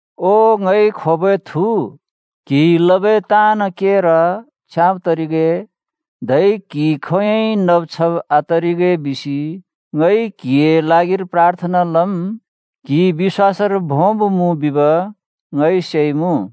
ओ ङइ खोबै थु, क्‍हिइ लबै ताँन् केर छ्याँब तरिगे, धै क्हि खोंयोंइ नब छब आतरिगे बिसि ङइ क्हिए ल्हागिर प्राथना लम्। क्‍हि बिश्‍वासर भोंब मुँ बिब ङइ सेइमुँ।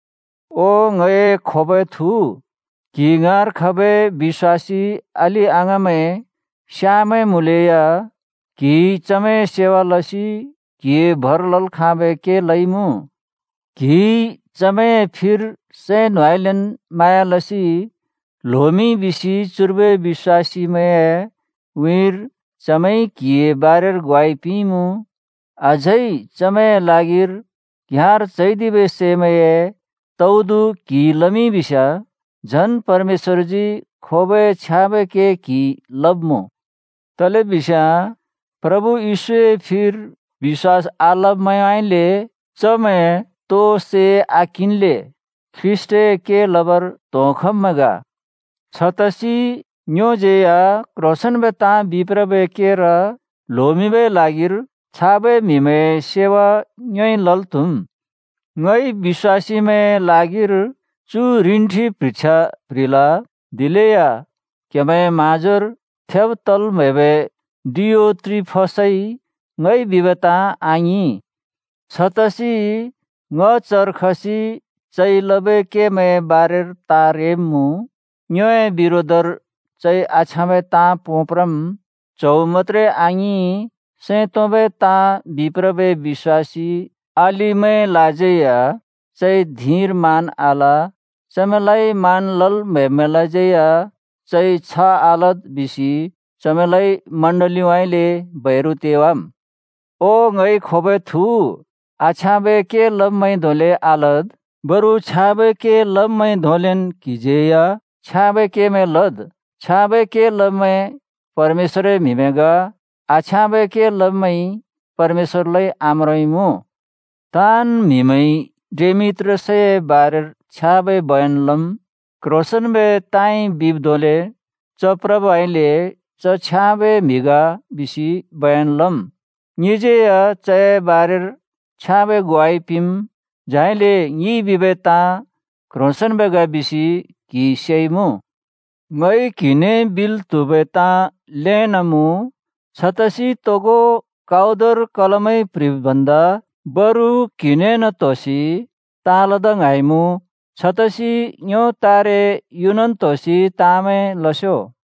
ओ ङए खोबै थु, क्हि ङाँर खबै बिश्‍वासी अलि-अङाँमैं स्याँमैं मुँलेया क्हिइ चमैंए सेवा लसि क्हिइ भर लल् खाँबै के लइमुँ। क्‍हिइ चमैंए फिर सैं न्होंउँइँलेन् म्हाँया लसि ल्होमिंइ बिसि चुर्बै बिश्‍वासीमैंए उँइँरि चमैंइ क्‍हिए बारेर ग्वाइ पिंइमुँ। अझै चमैंए ल्हागिर घ्‍याँर चैदिबै सैमैंए तौदु क्हिइ लमिंइ बिस्याँ झन् परमेश्‍वरजी खोबै छ्याँबै के क्हिइ लब्मुँ। तलेबिस्याँ प्रभु येशूए फिर बिश्‍वास आलब्मैंउँइँले चमैंइ तोइ सै आकिंल्‍ले ख्रीष्‍टए के लबर त्होंखब्मैं ग। छतसि ङ्योज्यै या क्ह्रोंसेंन्बै ताँ बिप्रबै केर ल्होमिंबै ल्हागिर छाबै म्‍हिमैंए सेवा ङ्योइ लल् त्‍हुम्। ङइ बिश्‍वासीमैंए ल्हागिर च्‍यु रिन्ठि प्ह्रिछ्या प्‍ह्रिल, दिलेया क्हेमैंए म्हाँजोर थेब् तल् म्‍हैबै डियोत्रिफसइ ङइ बिबै ताँ आङिं। छतसि ङ चर खसि चइ लबै केमैंए बारेर ताँ रेब्‍मुँ। ङ्योए बिरोधर चइ आछ्याँबै ताँ पोंप्रम्, च्‍हौ मत्‍त्रे आङिं सैं तोंबै ताँ बिप्रबै बिश्‍वासी अलिमैंलाज्यै या चइ धिंर मान आल। चमैंलाइ मान लल् म्‍हैब्‍मैंलाज्यै या चइ छ आलद् बिसि चमैंलाइ मण्डलीउँइँले बैरु तेवाम्। ओ ङइ खोबै थु, आछ्याँबै के लब्मैंइ धोंले आलद्, बरु छ्याँबै के लब्मैंइ धोंलेन् क्हिज्यै या छ्याँबै केमैं लद्। छ्याँबै के लब्मैं परमेश्‍वरए म्हिमैं ग, आछ्याँबै के लब्मैंइ परमेश्‍वरलाइ आम्रोंइमुँ। ताँन् म्‍हिमैंइ डेमेत्रियसए बारेर छ्याँबै बयन लम्। क्ह्रोंसेंन्‍बै ताँइ बिब् धोंले च प्रबइले च छ्याँबै म्हि ग बिसि बयन लम्। ङिज्‍यै या चए बारेर छ्याँबै ग्वाइ पिंम्, झाइले ङिइ बिबै ताँ क्ह्रोंसेंन्बै ग बिसि क्‍हिइ सेइमुँ। ङइ क्हिने बिल् त्‍हुबै ताँ ल्‍हेन् मुँ, छतसि तोगो काउदर कलमइ प्ह्रिब् भन्दा बरु क्‍हिनेन् त्‍होसि ताँ लदा ङ्हाँइमुँ। छतसि ङ्यो तारे युनन् त्होसि ताँमैं लस्यो।